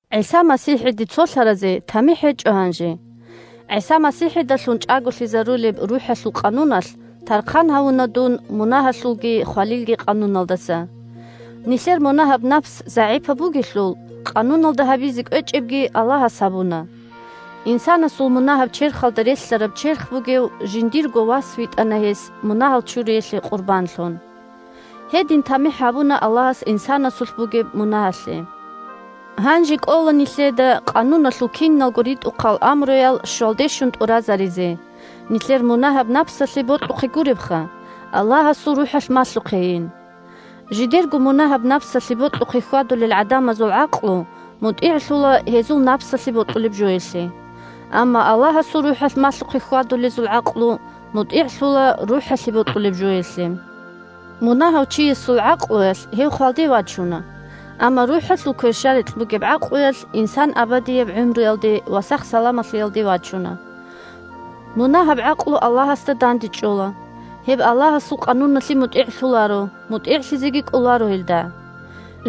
ГӀиса МасихӀиде цолъаразе тамихӀ гьечӀо гьанже. ГӀиса МасихӀидалъун чӀаголъизарулеб РухӀалъул къануналъ тархъан гьавуна дун мунагьалъулги хвалилги къануналдаса. Нилъер мунагьаб напс загӀипаб бугелъул, Къануналда гьабизе кӀвечӀебги Аллагьас гьабуна. Инсанасул мунагьаб черхалда релълъараб черх бугев жиндирго Вас витӀана гьес мунагьал чуриялъе къурбанлъун. Гьедин тамихӀ гьабуна Аллагьас инсанасулъ бугеб мунагьалъе. Гьанже кӀола нилъеда Къануналъул киналго ритӀухъал амруял щвалде щун тӀуразаризе – нилъер мунагьаб напсалъе бокьухъе гуребха, Аллагьасул РухӀалъ малъухъейин. Жидерго мунагьаб напсалъе бокьухъе хьвадулел гӀадамазул гӀакълу мутӀигӀлъула гьезул напсалъе бокьулеб жоялъе. Амма Аллагьасул РухӀалъ малъухъе хьвадулезул гӀакълу мутӀигӀлъула РухӀалъе бокьулеб жоялъе. Мунагьав чиясул гӀакълуялъ гьев хвалде вачуна, амма РухӀалъул кверщаликь бугеб гӀакълуялъ инсан абадияб гӀумруялде ва сах-саламалъиялде вачуна. Мунагьаб гӀакълу Аллагьасда дандечӀола. Гьеб Аллагьасул къануналъе мутӀигӀлъуларо, мутӀигӀлъизеги кӀоларо гьелда.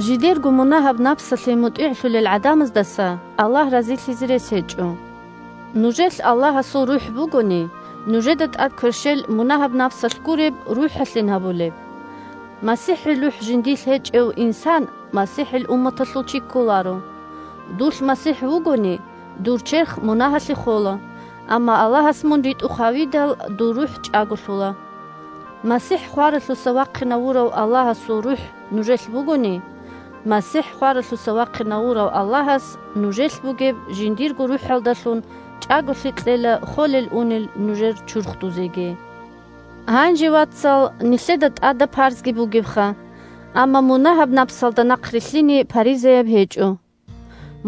Жидерго мунагьаб напсалъе мутӀигӀлъулел гӀадамаздаса Аллагь разилъизе рес гьечӀо. Нужелъ Аллагьасул РухӀ бугони, нужеда тӀад кверщел мунагьаб напсалъ гуреб, РухӀалъин гьабулеб. МасихӀил РухӀ жиндилъ гьечӀев инсан МасихӀил умматалъул чи кколаро. Дулъ МасихӀ вугони, дур черх мунагьалъе хола, амма Аллагьас мун ритӀухъ гьавидал, дур рухӀ чӀаголъула. МасихӀ хваралъуса вахъинавурав Аллагьасул РухӀ нужелъ бугони, МасихӀ хваралъуса вахъинавурав Аллагьас нужелъ бугеб жиндирго РухӀалдалъун чӀаголъи кьела холел-унел нужер чурхдузеги. Гьанже, вацал, нилъеда тӀадаб парзги бугебха, амма мунагьаб напсалда нахърилълъине паризаяб гьечӀо.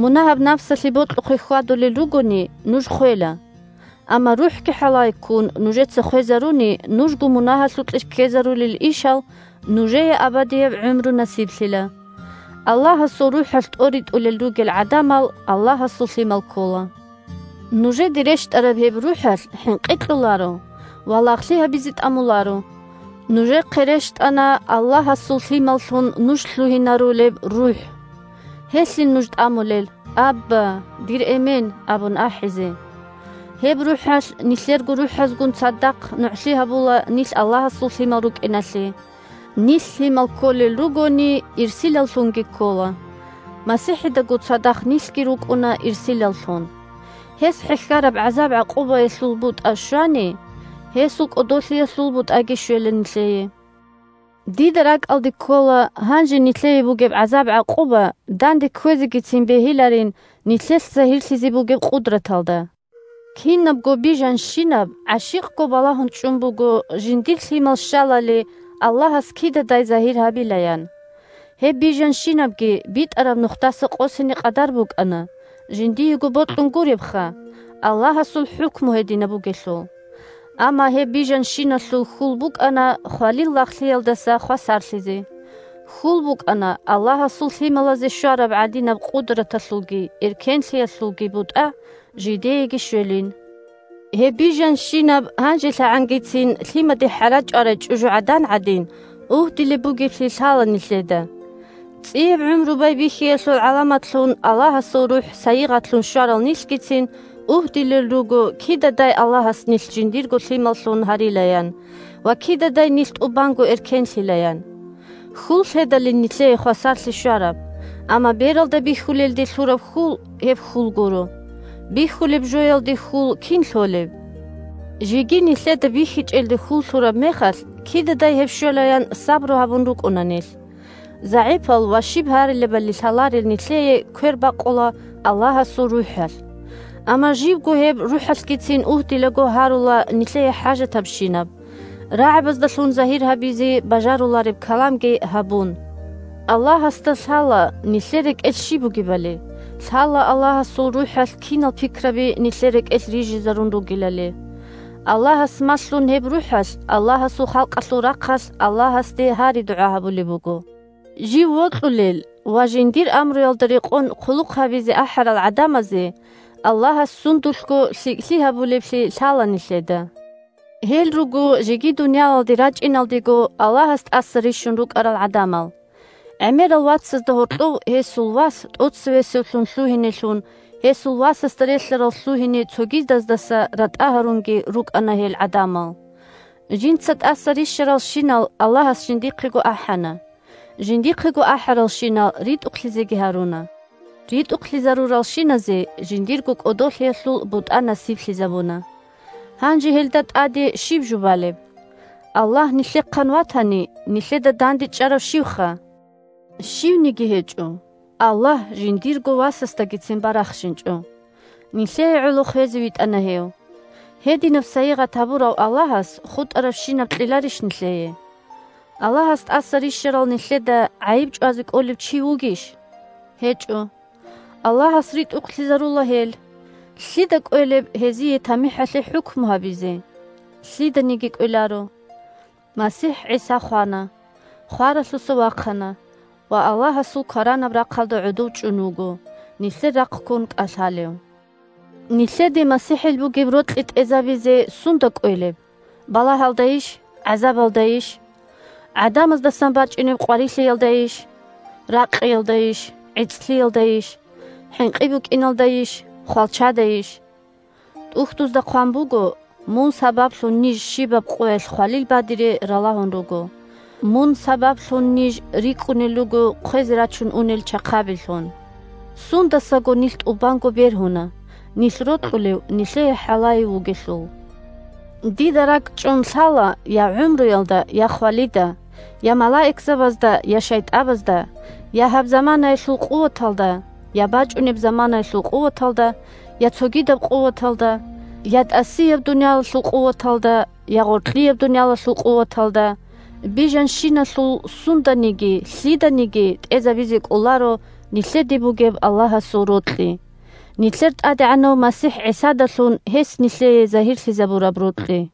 Мунагьаб напсалъе бокьухъе хьвадулел ругони, нуж хвела. Амма, РухӀги хӀалае ккун, нужеца хвезаруни нужго мунагьалъукье ккезарулел ишал, нужее абадияб гӀумру насиблъила. Аллагьасул РухӀалъ тӀоритӀулел ругел гӀадамал Аллагьасул лъимал ккола. Нужеде рещтӀараб гьеб РухӀалъ хӀинкъи кьоларо ва лагълъи гьабизе тӀамуларо. Нужехъе рещтӀана Аллагьасул лъималлъун нуж лъугьинарулеб РухӀ. Гьелъин нуж тӀамулел: «Абба, дир эмен!» – абун ахӀизе. Гьеб РухӀалъ, нилъерго рухӀазгун цадахъ, нугӀлъи гьабула нилъ Аллагьасул лъимал рукӀиналъе. Нилъ лъимал кколел ругони, ирсилаллъунги ккола. МасихӀидаго цадахъ нилъги рукӀуна ирсилаллъун. Гьес хӀехьараб гӀазаб-гӀакъубаялъул бутӀа щвани, гьесул кӀодолъиялъул бутӀаги щвела нилъее. Дида ракӀалде ккола, гьанже нилъее бугеб гӀазаб-гӀакъуба данде кквезегицин бегьиларин нилъелъ загьирлъизе бугеб къудраталда. Кинабго бижанщинаб гӀащикъго балагьун чӀун буго жиндир лъимал щалали Аллагьас кидадай загьир гьабилаян. Гьеб бижанщинабги битӀараб нухдаса къосине къадар букӀана, жиндиего бокьун гуребха, – Аллагьасул хӀукму гьединаб бугелъул. Амма гьеб бижанщиналъул хьул букӀана хвалил лагълъиялдаса хвасарлъизе. Хьул букӀана Аллагьасул лъималазе щвараб гӀадинаб къудраталъулги эркенлъиялъулги бутӀа жидееги щвелин. Гьеб бижанщинаб гьанжелъагӀангицин, лъимаде хӀара чӀварай чӀужугӀадан гӀадин, угьдилеб бугеблъи лъала нилъеда. ЦӀияб гӀумру байбихьиялъул гӀаламатлъун Аллагьасул РухӀ сайигъатлъун щварал нилъгицин угьдилел руго кидадай Аллагьас нилъ жиндирго лъималлъун гьарилаян ва кидадай нилъ тӀубанго эркенлъилаян. Хьул лъедалин нилъее хвасарлъи щвараб. Амма бералда бихьулелде лъураб хьул – гьеб хьул гуро. Бихьулеб жоялде хьул кин лъолеб? Жеги нилъеда бихьичӀелде хьул лъураб мехалъ, кидадай гьеб щвелаян сабру гьабун рукӀуна нилъ. ЗагӀипал ва щиб гьарилебали лъаларел нилъее квер бакъула Аллагьасул РухӀалъ. Амма жибго гьеб РухӀалъгицин угьдилаго гьарула нилъее хӀажатабщинаб, рагӀабаздалъун загьир гьабизе бажарулареб каламги гьабун. Аллагьасда лъала нилъер рекӀелъ щиб бугебали, лъала Аллагьасул РухӀалъ кинал пикраби нилъер рекӀелъ рижизарун ругелали. Аллагьас малъун гьеб РухӀалъ, Аллагьасул халкъалъул рахъалъ Аллагьасде гьари-дугӀа гьабулеб буго. Жив вокьулел ва, жиндир амруялда рекъон, хъулухъ гьабизе ахӀарал гӀадамазе Аллагьас сундулъго лъикӀлъи гьабулеблъи лъала нилъеда. Гьел руго жеги дуниялалде рачӀиналдего Аллагьас тӀаса рищун рукӀарал гӀадамал. ГӀемерал вацазда гьоркьов гьесул Вас тӀоцевесевлъун лъугьинелъун, гьесул Васасда релълъарал лъугьине цогидаздаса ратӀа гьарунги рукӀана гьел гӀадамал. Жинца тӀаса рищаралщинал Аллагьас жиндихъего ахӀана, жиндихъего ахӀаралщинал ритӀухълъизеги гьаруна, ритӀухълъизаруралщиназе жиндирго кӀодолъиялъул бутӀа насиблъизабуна. Гьанже гьелда тӀаде щиб жубалеб? Аллагь нилъехъан ватани, нилъеда дандечӀарав щивха? Щивниги гьечӀо! Аллагь жиндирго Васасдагицин барахщинчӀо, нилъее гӀоло хвезе витӀана гьев. Гьединаб сайигъат гьабурав Аллагьас хутӀарабщинаб кьеларищ нилъее? Аллагьас тӀаса рищарал нилъеда гӀайиб чӀвазе кӀолев чи вугищ? ГьечӀо. Аллагьас ритӀухълъизарула гьел! Лъида кӀвелеб гьезие тамихӀалъе хӀукму гьабизе? Лъиданиги кӀвеларо! МасихӀ ГӀиса хвана, хваралъуса вахъана ва Аллагьасул кваранаб рахъалда гӀодов чӀун вуго, нилъер рахъккун кӀалъалев. Нилъеде МасихӀил бугеб рокьи тӀезабизе сунда кӀвелеб? Балагьалдайищ? ГӀазабалдайищ? ГӀадамаздасан бачӀунеб къварилъиялдайищ? Ракъиялдайищ? ГӀицӀлъиялдайищ? ХӀинкъи букӀиналдайищ? Хвалчадайищ?.. ТӀухьдузда хъван буго: «Мун сабаблъун ниж щибаб къоялъ хвалил бадире ралагьун руго. Мун сабаблъун ниж рикӀкӀунел руго хъвезе рачун унел чахъабилъун». Сундасаго нилъ тӀубанго бергьуна, нилъ рокьулев нилъее хӀалае вугелъул. Дида ракӀчӀун лъала я гӀумруялда, я хвалида, я малаикзабазда, я шайтӀабазда, я гьаб заманаялъул къуваталда, я бачӀунеб заманаялъул къуваталда, я цогидаб къуваталда, я тӀасияб дуниялалъул къуваталда, я гъоркьияб дуниялалъул къуваталда, бижанщиналъул сунданиги, лъиданиги тӀезабизе кӀоларо нилъеде бугеб Аллагьасул рокьи – нилъер ТӀадегӀанав МасихӀ ГӀисадалъун гьес нилъее загьирлъизабураб рокьи.